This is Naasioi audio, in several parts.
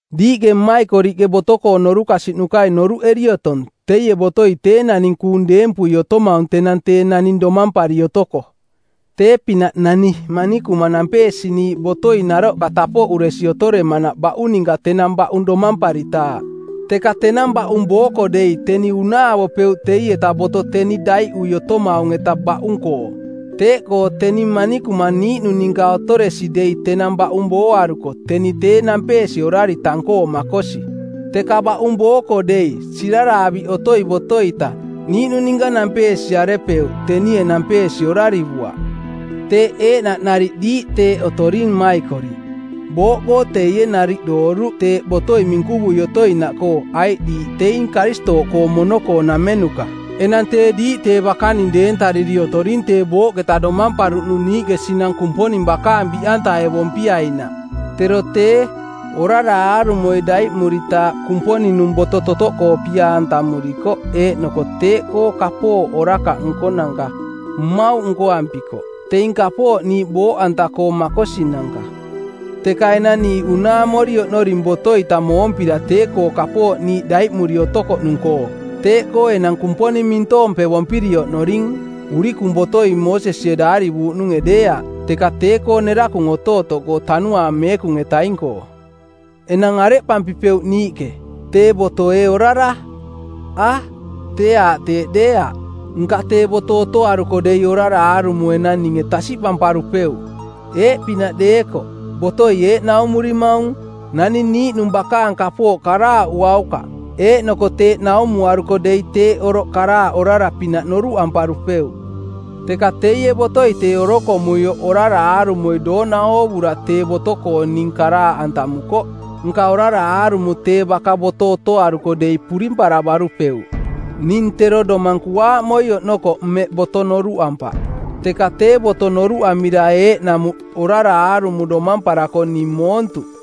Diiꞌke mmaikoriꞌke boto-koo norukasiꞌnukai noruꞌeri otong teie botoi tee naning kuung deempui otomaung tenang tee naning domampari otoko. Tee-pinaꞌ nani manikuma nampeesiniiꞌ botoi naroꞌ tapoꞌuresi otoremanaꞌ baꞌung ninka tenang baꞌung domamparitaaꞌ. Teka tenang baꞌung booko dei teni unaavopeuꞌ teieta boto teni daiꞌui otomaung-eta baꞌung-koo. Teeꞌkoo teni manikuma niiꞌnung ninka otoresi dei tenang baꞌung booaruko teni tee nampeesi orari tang-koo makosi. Teka baꞌung booko dei, siraraaviꞌ otoi boto-ita, niiꞌnung ninka nampeesiarepeuꞌ, tenie nampeesi orarivuaꞌ. Teeꞌ eeꞌnaꞌ nariꞌ diiꞌ teeꞌ otoring mmaikoriꞌ. Booꞌkoo teie nariꞌ dooruꞌ teeꞌ botoi minkuvui otoinaꞌkoo aiꞌ diiꞌ teing Karistooꞌkoo mono-koonamenuka. Enang tee diiꞌ tee bakaning deentariri otoring tee booꞌketa domamparuꞌnung niiꞌke sinang Kumponing bakaang biꞌantaevompiainaꞌ. Tero tee, orara aarumoi daiꞌmuritaaꞌ Kumponing-nung boto totoꞌkoo pia-antamurikoꞌ eeꞌnoko teeꞌkoo kapooꞌ orakaꞌ nkonanka mmauꞌ nkoampikoꞌ, teing kapooꞌ niiꞌ booꞌanta-koo makosinanka. Teka enang niiꞌ unaamori oꞌnoring boto-ita moompira tee-koo kapooꞌkoo niiꞌ daiꞌmuri otokoꞌnung-koo. Teeꞌkoo enang Kumponing mintoompevompiri oꞌnoring urikung botoi Moosesie daarivuuꞌnunge deeaꞌ teka tee-koo nerakung otootoꞌkoo Tanuaang Meekung-etaing-koo. Enang areꞌpampipeuꞌ niiꞌke? Tee boto ee orara? A, tee aaꞌ teeꞌ deeaꞌ. Nka tee boto otoaruko dei orara aarumo enang ninge tasiꞌpamparupeuꞌ. Eeꞌpinaꞌ deekoꞌ: Botoi eeꞌ naumurimaung: Naning niiꞌnung bakaang kapooꞌ karaaꞌuaukaꞌ. Eeꞌnoko teeꞌ naumuaruko dei teeꞌ oroꞌ karaaꞌ orara-pinaꞌ noruꞌamparupeuꞌ. Teka teie botoi tee orokomuioꞌ orara aarumoi doona oovura tee boto-koo ning karaaꞌantamukoꞌ, nka orara aarumo tee baka boto otoaruko dei purimparavarupeuꞌ. Ning tero domang kuaaꞌmoi oꞌnokoꞌ mmeꞌ boto noruꞌampaꞌ, teka tee boto noruꞌamira eeꞌnamuꞌ orara aarumo domamparako ning moontuꞌ.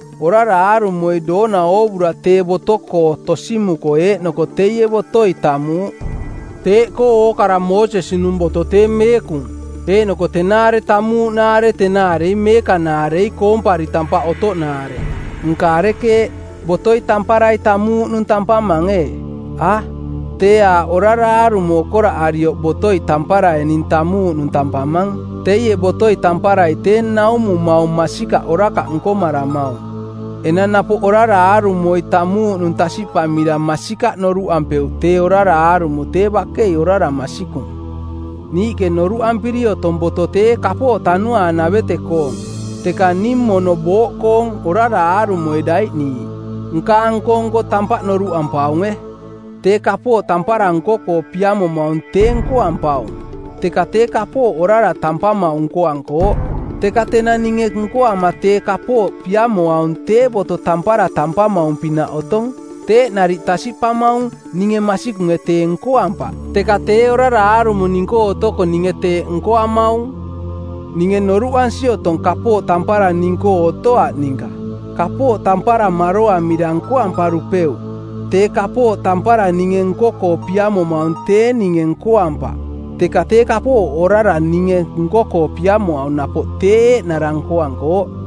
Orara aarumoi doona oovura tee boto-koo tosimukoꞌ eeꞌnoko teie botoi tamuuꞌ. Teeꞌkoo ookara Moosesi-nung boto tee meekung, eeꞌnoko tenaare tamuuꞌnaare tenaarei meekanaarei koompari tampaꞌ otoꞌnaare. Nka arekeeꞌ, botoi tamparai tamuuꞌnung tampamang, ee? A, tee aaꞌ orara aarumo okoraꞌarioꞌ botoi tamparai ning tamuuꞌnung tampamang. Teie botoi tamparai tee naumumaung masikaꞌ orakaꞌ nkomaramaung. Enang napoꞌ orara aarumoi tamuuꞌnung tasiꞌpamira masikaꞌ noruꞌampeuꞌ tee orara aarumo tee bakei orara masikung. Niiꞌke noruꞌampiri otong boto tee kapooꞌ tanuaanavete-koong, teka ning mono booꞌkoong, orara aarumoi daiꞌniiꞌ. Nkaang nko-nko tampaꞌ noruꞌampaunge, tee kapooꞌ tampara nko-koo piamomaung tee nkoampaung, teka tee kapooꞌ orara tampamaung nkoankooꞌ. Teka tenang ninge nkoama tee kapooꞌ piamoaung tee boto tampara tampamaung-pinaꞌ otong. Teeꞌ nariꞌ tasiꞌpamaung ninge masikunge tee nkoampaꞌ, teka tee orara aarumo ning-koo otoko ninge teeꞌ nkoamaung. Ninge noruꞌansi otong kapooꞌ tampara ning-koo otoaꞌ ninka. Kapooꞌ tampara maroamira nkoamparupeuꞌ. Tee kapooꞌ tampara ninge nko-koo piamomaung tee ninge nkoampaꞌ, teka tee kapooꞌ orara ninge nko-koo piamoaung napoꞌ tee eeꞌnara nkoankooꞌ.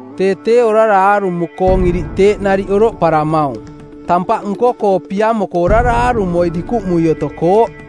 Tee tee orara aarumo-koong iriꞌ teeꞌ nariꞌ oroꞌparamaung. Tampaꞌ nko-koo piamoko orara aarumoi dikuꞌmui otokooꞌ.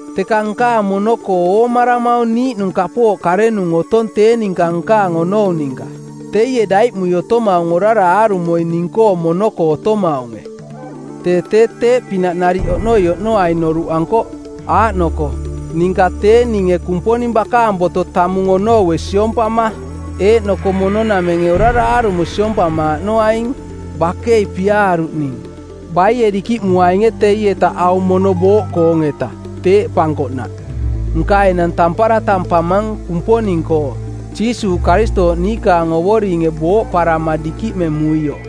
Teka nkaang mono-koo oomaramaung niiꞌnung kapooꞌ karenung otong tee ninka nkaang onou ninka. Teie daiꞌmui otomaung orara aarumoi ning-koo mono-koo otomaunge. Tee tee teeꞌ pinaꞌ nariꞌ oꞌnoi oꞌnoaing noruꞌankoꞌ, aaꞌnoko, ninka tee ninge Kumponing bakaang boto tamung onoue siompama eeꞌnoko mono-namenge orara aarumo siompamaaꞌnoaing. Bakei piaaruꞌ ning. Baie dikiꞌmuainge teietaꞌ aung mono booꞌkoong-eta? Teeꞌpankoꞌnaꞌ; Nka enang tampara tampamang Kumponing-koo, Jiisuuꞌ Karistooꞌ niikaang Ovoringe booꞌparama dikiꞌmemuioꞌ.